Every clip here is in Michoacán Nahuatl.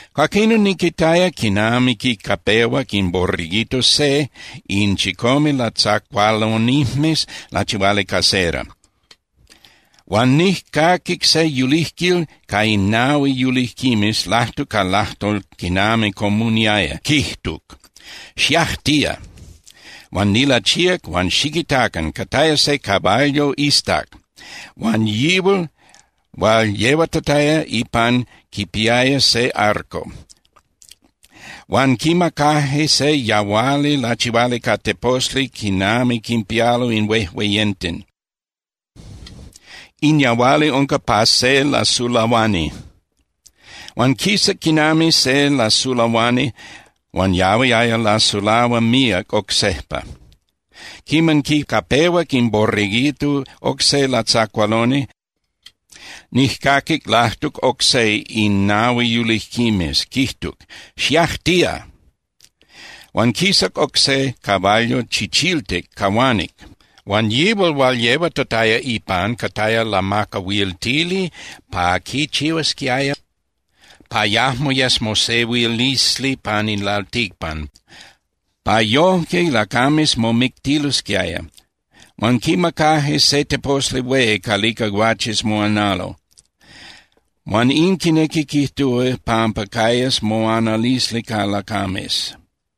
Cuaquinon niquitaya quiman quicapehuac in Borreguito se in chicome latzacualonijmes lachihuali ca cera, huan nijcaquic se yulijquil ca in nahui yulijquimes lajtuc ca ilajtol quinami comuniaya, quijtuc: —¡Xiajtía! Huan nilachíac huan ¡xiquitacan! Cataya se caballo iztac huan yihual hual yehuatataya ipan quipiaya se arco. Huan quimacaje se yahuali lachihuali ca teposli quinami quinpialo in hueyenten, in yahuali unca pa se lasulahuani. Huan quisac quinami se lasulahuani huan yahuiaya lasulahua míac oc sejpa. Quiman quicapehuac in Borreguito oc se latzacualoni, nijcaquic lajtuc oc se in nahui yulijquimes quijtuc: —¡Xiajtía! Huan quisac oc se caballo chichiltic cahuanic. Huan yihual hual yehuatataya ipan cataya lamacahuiltili pa quichihuasquiaya pa yajmo yes mosehuilisli pan in lalticpan, pa yojque lacames momictilosquiaya. Huan quimacaje se teposli hué calica guaches moanalo, huan in quinequi quijtúa pampa cayas moanalisli ca lacames.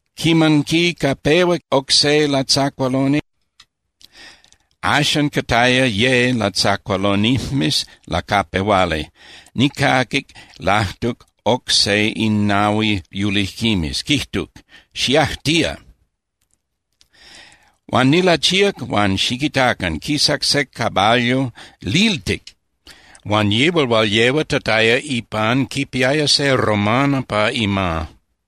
Quiman quicapehuac oc se latzacualoni, axan cataya ye latzacualonijmes lacapehuali, nijcaquic lajtuc oc se in nahui yulijquimes, quijtuc: —¡Xiajtía! Huan nilachíac huan ¡xiquitacan! Quisac se caballo liltic, huan yihual hual yehuatataya ipan quipiaya se romana pa ima.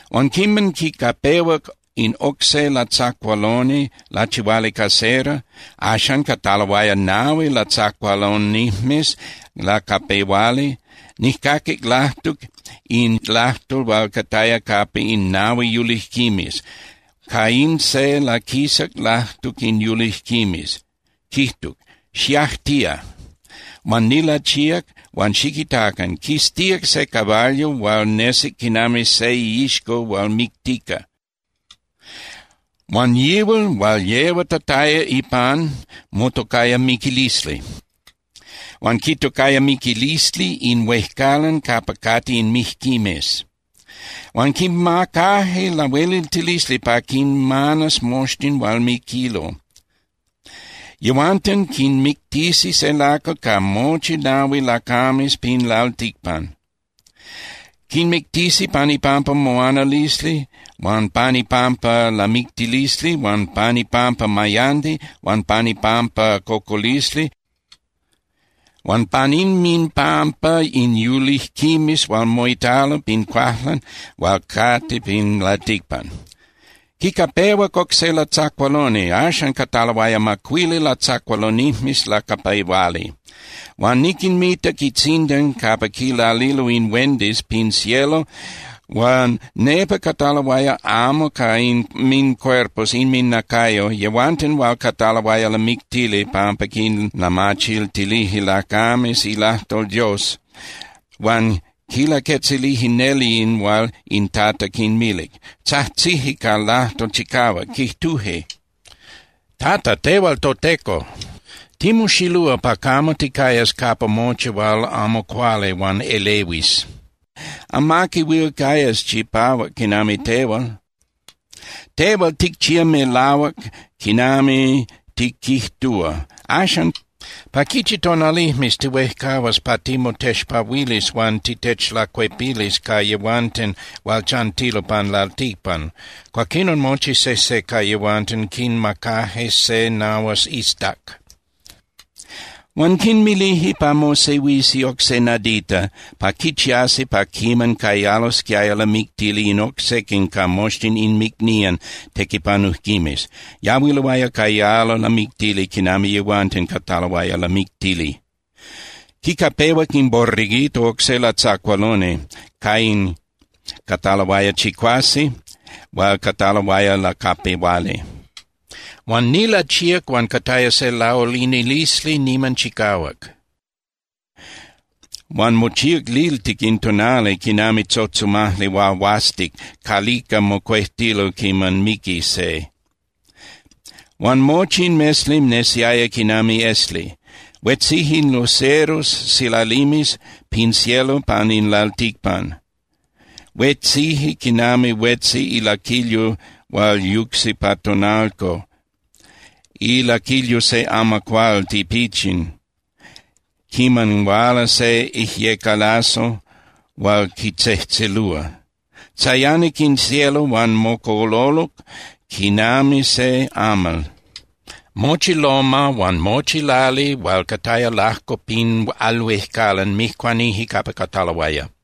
Huan quiman quicapehuac in oc se latzacualoni lachihuali ca cera, axan cataloaya nahui latzacualonijmes lacapehuali, nijcaquic lajtuc in lajtol hual cataya capa in nahui yulijquimes, ca in se laquisac lajtuc in yulijquimes, quijtuc: —¡Xiajtía! Huan nilachíac huan ¡xiquitacan! Quistíac se caballo hual nesic quinami se iixco hual mictica, huan yihual hual yehuatataya ipan motocaya Miquilisli. Huan quitocaya Miquilisli in huejcalan capa cate in mijquimes. Huan quimacaje lahueliltilisli pa quinmanas moxtin hual miquilo. Yehuanten quinmictisi se lacal ca mochi nahui lacames pin lalticpan. Quinmictisi pan ipampa moanalisli huan pan ipampa lamictilisli huan pan ipampa mayandi huan pan ipampa cocolisli huan pan inminpampa in yulijquimes hual moitalo pin cuajlan hual cate pin lalticpan. Quicapehuac oc se latzacualoni, axan cataloaya macuili latzacualonijmes lacapehuali. Huan niquinmitac itzindan capa quilalilo in huendis pin cielo huan nepa cataloaya amo ca inmincuerpos (inminacayo) yehuanten hual cataloaya lamictili pampa quinlamachiltilije lacames ilajtol Dios huan quinlaquetzilije neli in hual in Tata quinmilic. Tzajtzije ca lajtol chicahuac, quijtuje: —Tata, tehual toTeco, timoxilúa pa camo ticayas capa mochi hual amo cuali huan elehuis, amaqui huil cayas chipahuac quinami tehual. Tehual ticchía melahuac quinami tiquijtúa. Axan, ¿pa quichi tonalijmes tihuejcahuas pa timotexpahuilis huan titechlacuepilis ca yehuanten hual chantilo pan lalticpan? Cuaquinon mochi sejse ca yehuanten quinmacaje se nahuas iztac. Huan quinmilije pa mosehuisi oc se nadita pa quichiasi pa quiman cayalosquiaya lamictili in oc sequin ca moxtin inmicnían tequipanujquimes. Yahuiloaya cayalo lamictili quinami yehuanten cataloaya lamictili. Quicapehuac in Borreguito oc se latzacualoni, ca in cataloaya chicuase hual cataloaya lacapehuali. Huan nilachíac huan cataya se laulinilisli niman chicahuac. Huan mochíac liltic in tonali quinami tzotzomajli huahuastic calica mocuejtilo quiman miqui se. Huan mochi in mesli nesiaya quinami esli. Huetzije in luceros (silalimes) pin cielo pan in lalticpan. Huetzije quinami huetzi ilaquilyo hual yucsi pa tonalco, ilaquilyo se amacuál tipichin quiman huala se ijyecalazo hual quitzejtzelúa. Tzayanic in cielo huan mocololuc quinami se amal. Mochi loma (tepel) huan mochi lali hual cataya lajco pin al huejcalan mijcuanije capa cataloaya.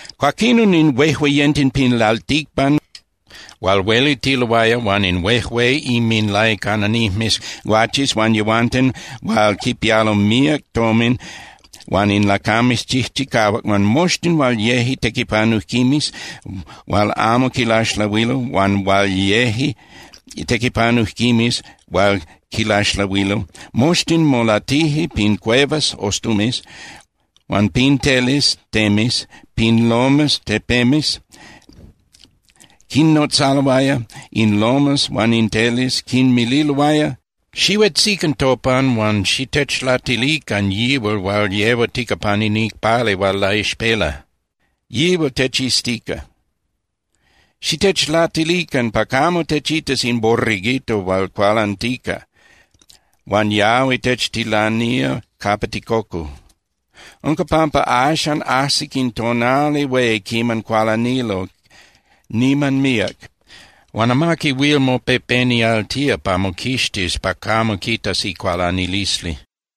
Cuaquinon in huejueyenten pin lalticpan hual huelitiloaya huan in huejué inminlaicananijmes guaches huan yehuanten hual quipialo míac tomin huan in lacames chijchicahuac huan moxtin hual yeje tequipanujquimes hual amo quilaxlahuilo huan hual yeje tequipanujquimes hual quilaxlahuilo, moxtin molatije pin cuevas (ostumes) huan pin teles (temes) pin lomas (tepemes). Quinnotzaloaya in lomas huan in teles, quinmililoaya: —Xihuetzican topan huan xitechlatilican yihual hual yehuatica pan in icpali hual laixpela, yihual techiztica. Xitechlatilican pa camo techitas in Borreguito hual cualantica, huan yahui techtilanía capa ticocu. Unca pampa axan ajsic in tonali hué quiman cualanilo niman míac, huan amaqui huil mopepenialtía pa moquixtis pa camo quitas icualanilisli.